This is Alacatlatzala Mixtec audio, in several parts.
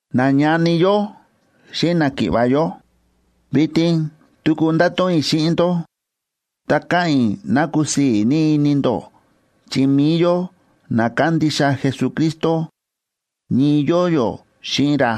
Nañani yó xíꞌin náki̱ꞌva̱ yó, vitin tuku ndáto̱ꞌon i̱ xíꞌin ndó, ta káꞌa̱n i̱ ná kusii̱ ní ini ndó chi mi̱i yó na kándixa Jesucristo, ñii yóo yó xíꞌin ra.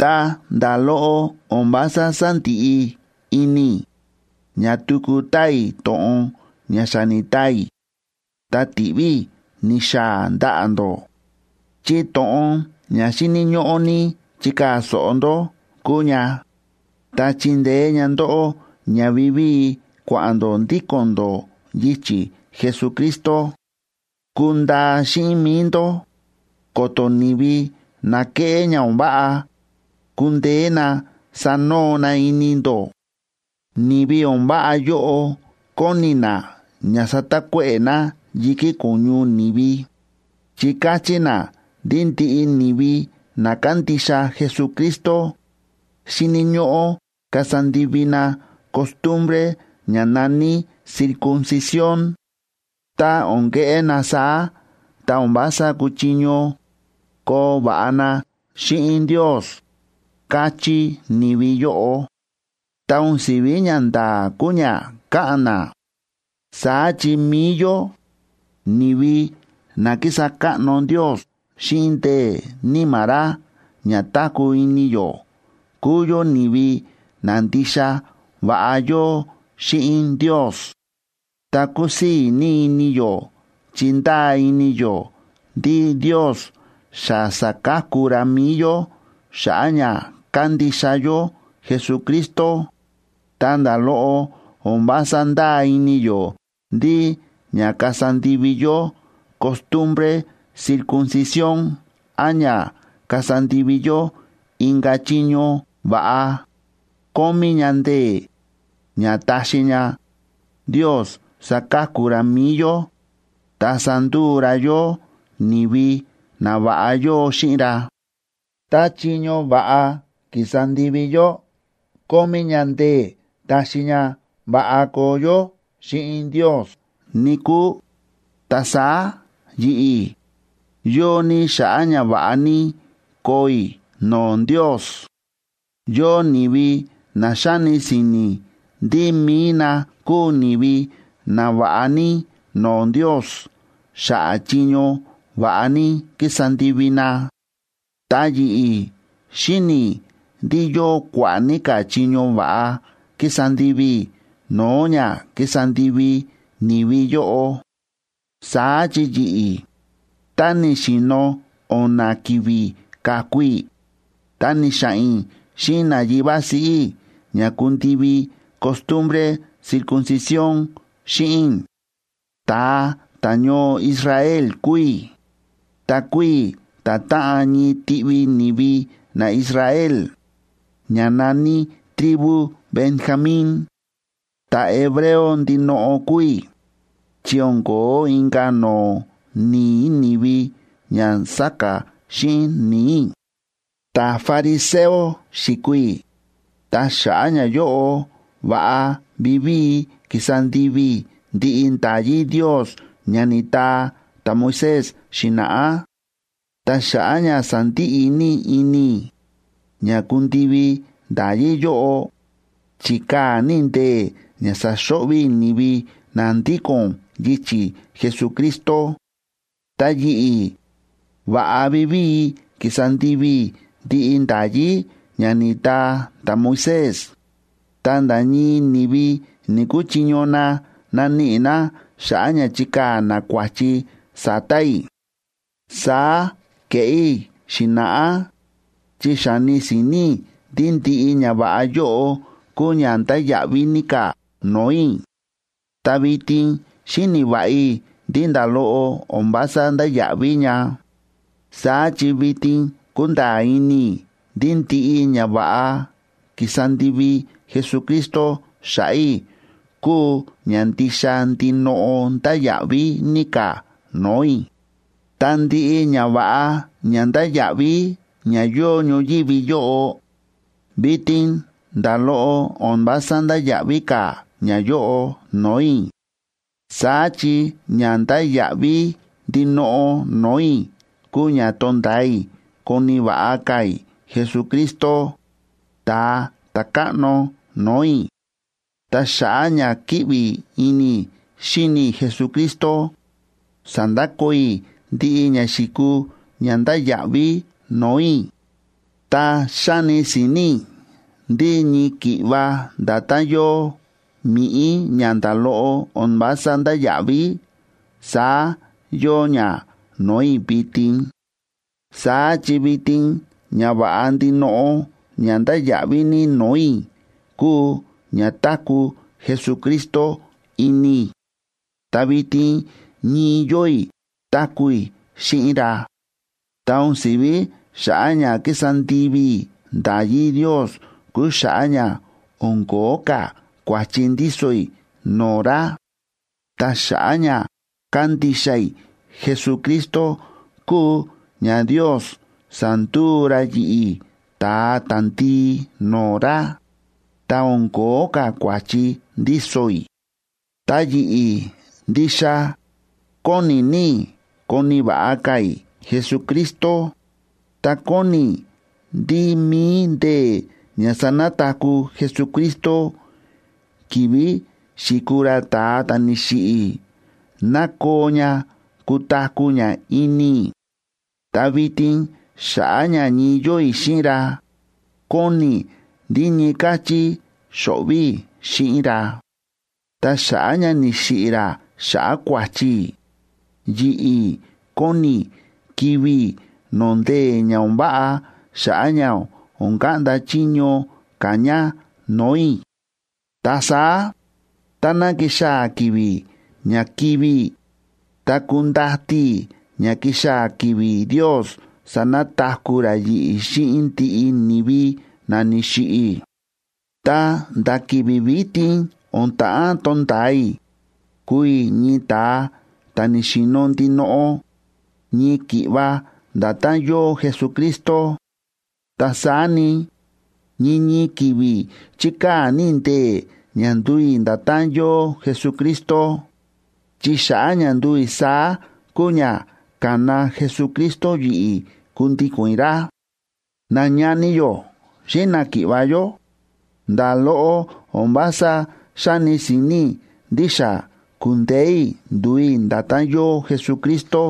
Ta nda̱ loꞌo o̱n vása sándiꞌi ini i̱ ña tuku taa i̱ to̱ꞌon ña xa ni̱taa i̱ ta ti̱ꞌví i̱ ni̱xaa̱ ndaꞌa̱ ndó, chi to̱ꞌon ña xíni̱ ñóꞌó ní chikaa̱ so̱ꞌo ndó kúu ña, ta chindeé ña ndóꞌó ña vivíi kua̱ꞌa̱n ndó ndíko̱n ndó yichi̱ Jesucristo. Kundaa xíꞌin mi̱i ndó, ko̱to̱ ni̱vi na kéꞌé ña o̱n váꞌa kundeé na sanoo na ini ndó. Ni̱vi o̱n váꞌa yóꞌo kóni na ña satakuéꞌe̱ na yi̱kí ko̱ñu ni̱vi, chi káchí na ndí ndiꞌi ni̱vi na kándixa Jesucristo xíni̱ ñóꞌó kasa ndivi na costumbre ña na̱ní circuncisión. Tá o̱n keꞌé na saá, ta o̱n vása kuchiño koo va̱ꞌa na xíꞌin Ndios, káchí ni̱vi yóꞌo.a Ta o̱n si̱ví ñanda̱a̱ kúu ña káꞌa̱n na. Saá chi mi̱i yó, ni̱vi na kísa káꞌno Ndios xíꞌin ndee̱ Níma̱ ra ña táku̱ ini yó kúu yó ni̱vi na ndixa va̱ꞌa yóo xíꞌin Ndios. Ta kúsii̱ ní ini yó chi ndáa ini yó ndí Ndios xa sa̱ka̱ku ra mi̱i yó xa̱ꞌa̱ ña kándixa yó Jesucristo, ta nda̱ loꞌo o̱n vása ndáa ini yó ndí ña kasa ndivi yó costumbre circuncisión án ña kasa ndivi yó inka̱ chiño va̱ꞌa, kómí ña ndee̱ ña taxi ña Ndios saka̱ku ra mi̱i yó ta sanduu ra yó ni̱vi na va̱ꞌa yóo xíꞌin ra. Tá chiño va̱ꞌa ki̱sa ndivi yó kómí ña ndee̱ taxi ña va̱ꞌa koo yó xíꞌin Ndios, níkúu, ta saá yi̱ꞌi̱, yóo ní xa̱ꞌa̱ ña va̱ꞌa ní koo i̱ no̱o̱ Ndios. Yóo ni̱vi na xáni si̱ni̱ ndí mi̱i na kúu ni̱vi nava̱ꞌa ní no̱o̱ Ndios xa̱ꞌa̱ chiño va̱ꞌa ní ki̱sa ndivi na. Ta yi̱ꞌi̱, xíni̱ i̱ ndí yóo kua̱ꞌa̱ ní ka̱ chiño va̱ꞌa ki̱sa ndivi i̱ no̱o̱ ña ki̱sa ndivi ni̱vi yóꞌo. Saá chi yi̱ꞌi̱, tá ni̱xi̱no̱ o̱na̱ ki̱vi̱ ka̱ku i̱, ta ni̱xa̱ꞌa̱n i̱ xíꞌin nayivá siꞌí i̱ ña kundivi costumbre circuncisión xíꞌin i̱. Ta̱a ta̱ñoo Israel kúu i̱, ta kúu i̱ ta̱táꞌan ñii tiꞌvi ni̱vi naIsrael, ña na̱ní tribu Benjamín. Ta̱hebreo ndinoꞌo kúu i̱, chi o̱n ko̱ó inka̱ no̱o̱ ni̱i̱ ni̱vi ña sáka̱ xíꞌin ni̱i̱ i̱. Ta̱fariseo xi̱kuu i̱, ta xa̱ꞌa̱ ñayóꞌo, va̱ꞌa vivíi ki̱sa ndivi i̱ ndiꞌi nda̱yí Ndios ña ni̱taa ta̱Moisés xi̱na̱ꞌá. Ta xa̱ꞌa̱ ña sa̱ndiꞌi ní ini i̱ ña kundivi nda̱yí yóꞌo, chi̱kaa̱ ní i̱ ndee̱ ña sa̱xo̱ꞌvi̱ i̱ ni̱vi na ndíko̱n yichi̱ Jesucristo. Ta yi̱ꞌi̱, va̱ꞌa vivíi ki̱sa ndivi i̱ ndiꞌi nda̱yí ña ni̱taa ta̱Moisés, ta nda̱ ñii ni̱vi ni̱‑kuchiño na naníꞌi na xa̱ꞌa̱ ña chikaa̱ na kua̱chi sa̱ta̱ i̱. Saá ke̱ꞌé i̱ xi̱na̱ꞌá chi xa̱ni si̱ni̱ i̱ ndí ndiꞌi ñava̱ꞌa yóꞌo kúu ña ndáya̱ꞌví ní ka̱ no̱o̱ i̱. Ta vitin xíni̱ va̱ꞌa i̱ ndí nda̱ loꞌo o̱n vása ndáya̱ꞌví ña. Saá chi vitin kúnda̱a̱ ini i̱ ndí ndiꞌi ñava̱ꞌa ki̱sa ndivi Jesucristo xa̱ꞌa̱ i̱ kúu ña ndixa ndinoꞌo ndáya̱ꞌví ní ka̱ no̱o̱ i̱. Ta ndiꞌi ñava̱ꞌa ña ndáya̱ꞌví ña yóo ñoyívi yóꞌo, vitin nda̱ loꞌo o̱n vása ndáya̱ꞌví ka̱ ñayóꞌo no̱o̱ i̱. Saá chi ña ndáya̱ꞌví ndinoꞌo no̱o̱ i̱ kúu ña tonda̱a i̱ koni̱ va̱ꞌa ka̱ i̱ Jesucristo, Ta̱a Ta̱káꞌno no̱o̱ i̱. Ta xa̱ꞌa̱ ña kíꞌvi ini i̱ xíni i̱ Jesucristo, sa̱ndakoo i̱ ndiꞌi ña xi̱kuu ña ndáya̱ꞌví no̱o̱ i̱, ta xáni si̱ni̱ i̱ ndí ñii ki̱ꞌva nda̱tán yóo mi̱ꞌí ña nda̱ loꞌo o̱n vása ndáya̱ꞌví, saá yóo ña no̱o̱ i̱ vitin. Saá chi vitin ñava̱ꞌa ndinoꞌo ña ndáya̱ꞌví ní no̱o̱ i̱ kúu ña táku̱ Jesucristo ini i̱. Ta vitin ñii yóo i̱ táku̱ i̱ xíꞌin ra. Ta o̱n si̱ví xa̱ꞌa̱ ña ki̱sa ndivi i̱ nda̱yí Ndios kúu xa̱ꞌa̱ ña o̱n ko̱ó ka̱ kua̱chi ndíso i̱ no̱o̱ ra. Ta xa̱ꞌa̱ ña kándixa i̱ Jesucristo kúu ña Ndios sa̱nduu ra yi̱ꞌi̱ ta̱a ta̱ndii no̱o̱ ra, ta o̱n ko̱ó ka̱ kua̱chi ndíso i̱. Ta yi̱ꞌi̱, ndixa kóni ní i̱ koni̱ va̱ꞌa ka̱ i̱ Jesucristo, ta kóni i̱ ndí mi̱i ndee̱ ña sa̱nataku̱ Jesucristo ki̱vi̱ xi̱kuu ra ta̱a ta̱ ni̱xiꞌi̱, nakoo ña kutaku̱ ña ini i̱. Ta vitin xa̱ꞌa̱ ña ñii yóo i̱ xíꞌin ra, kóni i̱ ndí ñii káchí xo̱ꞌvi̱ i̱ xíꞌin ra. Ta xa̱ꞌa̱ ña ni̱xiꞌi̱ ra xa̱ꞌa̱ kua̱chi i̱, yi̱ꞌi̱ kóni i̱ kivi̱ i̱ no̱o̱ ndee̱ ña o̱n váꞌa xa̱ꞌa̱ ña o̱n kaꞌnda chiño ka̱ ña no̱o̱ i̱. Ta saá táná kixaa̱ ki̱vi̱ ña kivi̱ i̱, ta kundati i̱ ña kixaa̱ ki̱vi̱ Ndios sanataku̱ ra yi̱ꞌi̱ xíꞌin ndiꞌi ni̱vi na ni̱xiꞌi̱. Ta nda̱ ki̱vi̱ vitin o̱n ta̱ꞌán tonda̱a i̱ kuu i̱ ñii ta̱a ta̱ ni̱xi̱no̱ ndinoꞌo, ñii ki̱ꞌva nda̱tán yóo Jesucristo. Ta saá ni, ñii ñii ki̱vi̱ chíkaa̱ ní i̱ ndee̱ ña nduu i̱ nda̱tán yóo Jesucristo, chi xa̱ꞌa̱ ña nduu i̱ saá kúu ña ka̱na Jesucristo yi̱ꞌi̱ kundíko̱n i̱ ra. Nañani yó xíꞌin náki̱ꞌva̱ yó, nda̱ loꞌo o̱n vása xáni si̱ni̱ i̱ ndí xa ku̱ndeé i̱ nduu i̱ nda̱tán yóo Jesucristo.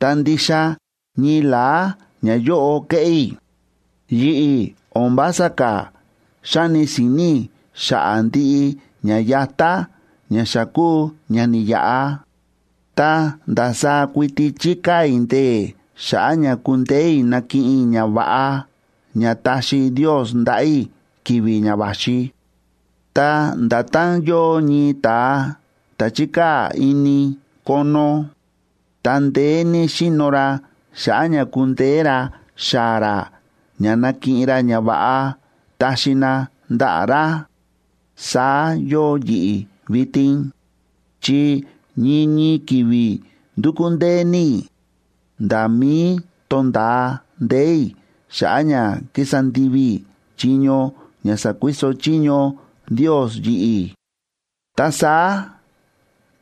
Ta ndixa ñii la̱á ñayóꞌo kéꞌé i̱; yi̱ꞌi̱ o̱n vása ka̱ xáni si̱ni̱ i̱ xa̱ꞌa̱ ndiꞌi ña yatá ña xa kúu ña ni̱yaꞌa, ta ndasaá kuiti chíkaa̱ i̱ ndee̱ xa̱ꞌa̱ ña kundeé i̱ nakiꞌin i̱ ñava̱ꞌa ña taxi Ndios ndaꞌa̱ i̱ ki̱vi̱ ña va̱xi. Ta nda̱tán yóo ñii ta̱a ta̱ chi̱kaa̱ ini kono, ta ndeé ní xíno ra xa̱ꞌa̱ ña kundeé ra xaa̱ ra ña nakiꞌin ra ñava̱ꞌa taxi na ndaꞌa̱ ra, saá yóo yi̱ꞌi̱ vitin, chi ñii ñii ki̱vi̱ ndúkú ndee ní i̱ nda̱ mí tónda̱a ndee̱ i̱ xa̱ꞌa̱ ña kísa ndivi i̱ chiño ña sa̱kuiso chiño Ndios yi̱ꞌi̱. Ta saá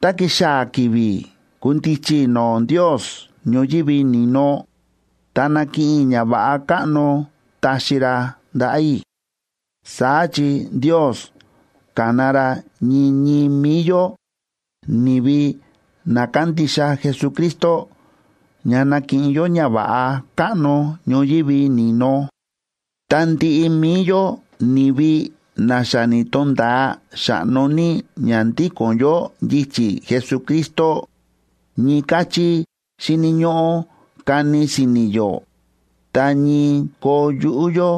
tá kixaa̱ ki̱vi̱ kundichi i̱ no̱o̱ Ndios ñoyívi ni̱no, ta nakiꞌin i̱ ñava̱ꞌa káꞌno taxi ra ndaꞌa̱ i̱. Saá chi Ndios ka̱na ra ñii ñii mi̱i yó, ni̱vi na kándixa Jesucristo, ña nakiꞌin yó ñava̱ꞌa káꞌno ñoyívi ni̱no. Ta ndiꞌi mi̱i yó, ni̱vi na xa ni̱to̱nda̱a xa̱ꞌno ní ña ndíko̱n yó yichi̱ Jesucristo, ñii káchí xíni̱ ñóꞌó kani si̱ni̱ yó ta ñii koo yuꞌú yó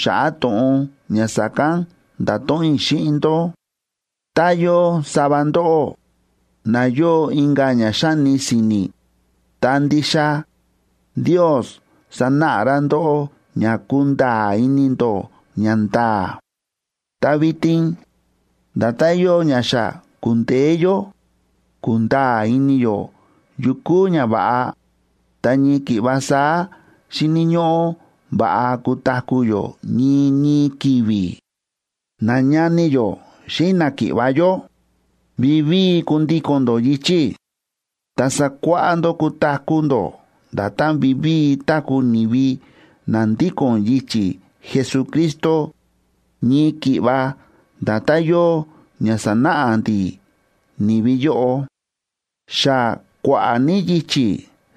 xa̱ꞌa̱ to̱ꞌon ña sa̱kán nda̱to̱ꞌon i̱ xíꞌin ndó. Tá yóo sava ndóꞌó na yóo inka̱ ña xáni si̱ni̱, ta ndixa Ndios sanáꞌa ra ndóꞌó ña kunda̱a̱ ini ndó ñanda̱a̱. Ta vitin, nda̱tán yóo ña xa ku̱ndeé yó kúnda̱a̱ ini yó yu kúu ñava̱ꞌa, ta ñii ki̱ꞌva saá xíni̱ ñóꞌó va̱ꞌa kutaku̱ yó ñii ñii ki̱vi̱. Nañani yó xíꞌin náki̱ꞌva̱ yó, vivíi kundíko̱n ndó yichi̱ i̱. Ta sakuáꞌá ndó kutaku̱ ndó nda̱tán vivíi táku̱ ni̱vi na ndíko̱n yichi̱ Jesucristo ñii ki̱ꞌva nda̱tán yóo ña sa̱náꞌa ndi̱ ni̱vi yóꞌo. Xa kua̱ꞌa̱ ní yichi̱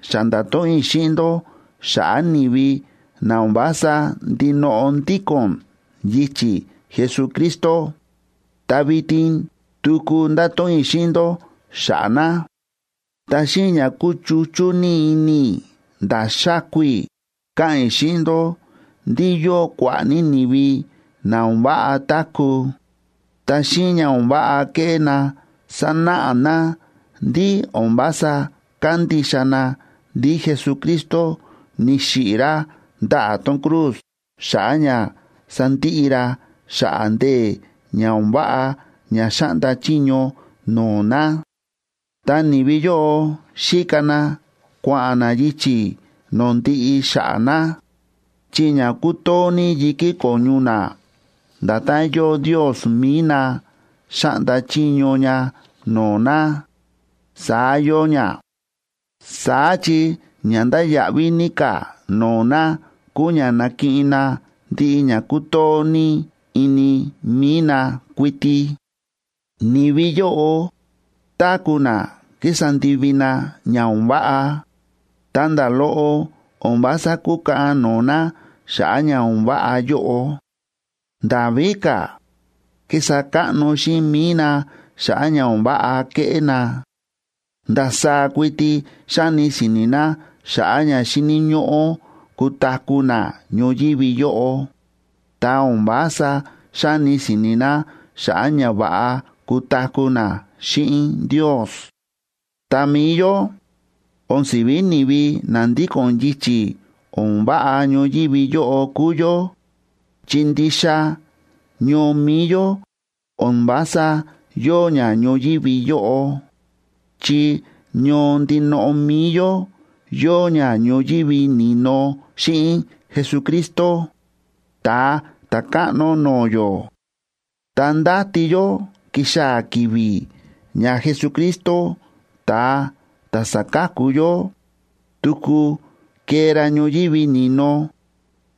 xa nda̱to̱ꞌon i̱ xíꞌin ndó xa̱ꞌa̱ ni̱vi na o̱n vása ndinoꞌo ndíko̱n yichi̱ Jesucristo, ta vitin tuku ndáto̱ꞌon i̱ xíꞌin ndó xa̱ꞌa̱ na. Ta xíꞌin ña kúchuchú ní ini i̱ nda̱ xáku i̱, káꞌa̱n i̱ xíꞌin ndó ndí yóo kua̱ꞌa̱ ní ni̱vi na o̱n váꞌa táku̱, ta xíꞌin ña o̱n váꞌa kéꞌé na sánáꞌa na ndí o̱n vása kándixa na ndí Jesucristo ni̱xiꞌi̱ ra ndaꞌa̱ tón cruz xa̱ꞌa̱ ña sandiꞌi ra xa̱ꞌa̱ ndee̱ ña o̱n váꞌa ña xáꞌnda chiño no̱o̱ na. Ta ni̱vi yóꞌo xíka na kua̱ꞌa̱n na yichi̱ no̱o̱ ndiꞌi xa̱ꞌa̱ na, chi ña kútoo ní yi̱kí ko̱ñu na, nda̱tán yóo ndios mi̱i na xáꞌnda chiño ña no̱o̱ na, saá yóo ña. Saá chi ña ndáya̱ꞌví ní ka̱ no̱o̱ na kúu ña nakiꞌin na ndiꞌi ña kútoo ní ini mi̱i na kuiti. Ni̱vi yóꞌo táku̱ na kísa ndivi na ña o̱n váꞌa, ta nda̱ loꞌo o̱n vása kúkaꞌan no̱o̱ na xa̱ꞌa̱ ña o̱n váꞌa yóꞌo. Nda̱ víka̱, kísa káꞌno xíꞌin mi̱i na xa̱ꞌa̱ ña o̱n váꞌa kéꞌé na. Ndasaá kuiti xáni si̱ni̱ na xa̱ꞌa̱ ña xíni̱ ñóꞌó kutaku̱ na ñoyívi yóꞌo, ta o̱n vása xáni si̱ni̱ na xa̱ꞌa̱ ña va̱ꞌa kutaku̱ na xíꞌin Ndios. Ta mi̱i yó, o̱n si̱ví ni̱vi na ndíko̱n yichi̱ o̱n váꞌa ñoyívi yóꞌo kúu yó, chi ndixa ñoo mi̱i yó o̱n vása yóo ña ñoyívi yóꞌo, chi ñoo ndinoꞌo mi̱i yó yóo ña ñoyívi ni̱no xíꞌin Jesucristo, Ta̱a Ta̱káꞌno no̱o̱ yó. Ta ndáti yó kixaa̱ ki̱vi̱ ña Jesucristo, ta̱a ta̱ sáka̱ku yó, tuku kee ra ñoyívi ni̱no,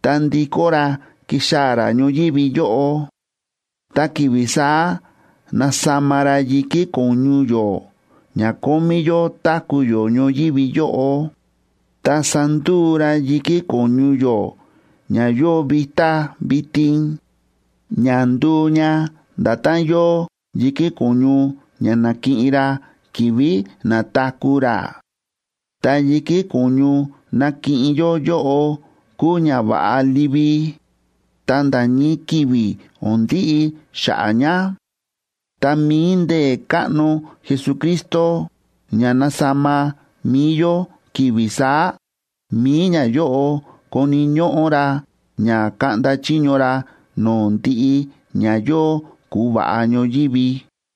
ta ndikó ra kixaa̱ ra ñoyívi yóꞌo. Ta ki̱vi̱ saá nasama ra yi̱kí ko̱ñu yó ña kómí yó táku̱ yó ñoyívi yóꞌo, ta sanduu ra yi̱kí ko̱ñu yó ña yóo vitá vitin, ña nduu ña nda̱tán yóo yi̱kí ko̱ñu ña na̱kiꞌin ra ki̱vi̱ na̱taku̱ ra. Ta yi̱kí ko̱ñu nakiꞌin yó yóꞌo kuu ñava̱ꞌa livi, ta nda̱ ñii ki̱vi̱ o̱n ndiꞌi xa̱ꞌa̱ ña. Ta mi̱i ndee̱ káꞌno Jesucristo ña nasama mi̱i yó ki̱vi̱ saá, mi̱i ñayóꞌo koni̱ ñóꞌó ra ña kaꞌnda chiño ra no̱o̱ ndiꞌi ña yóo ku̱va̱ꞌa ñoyívi.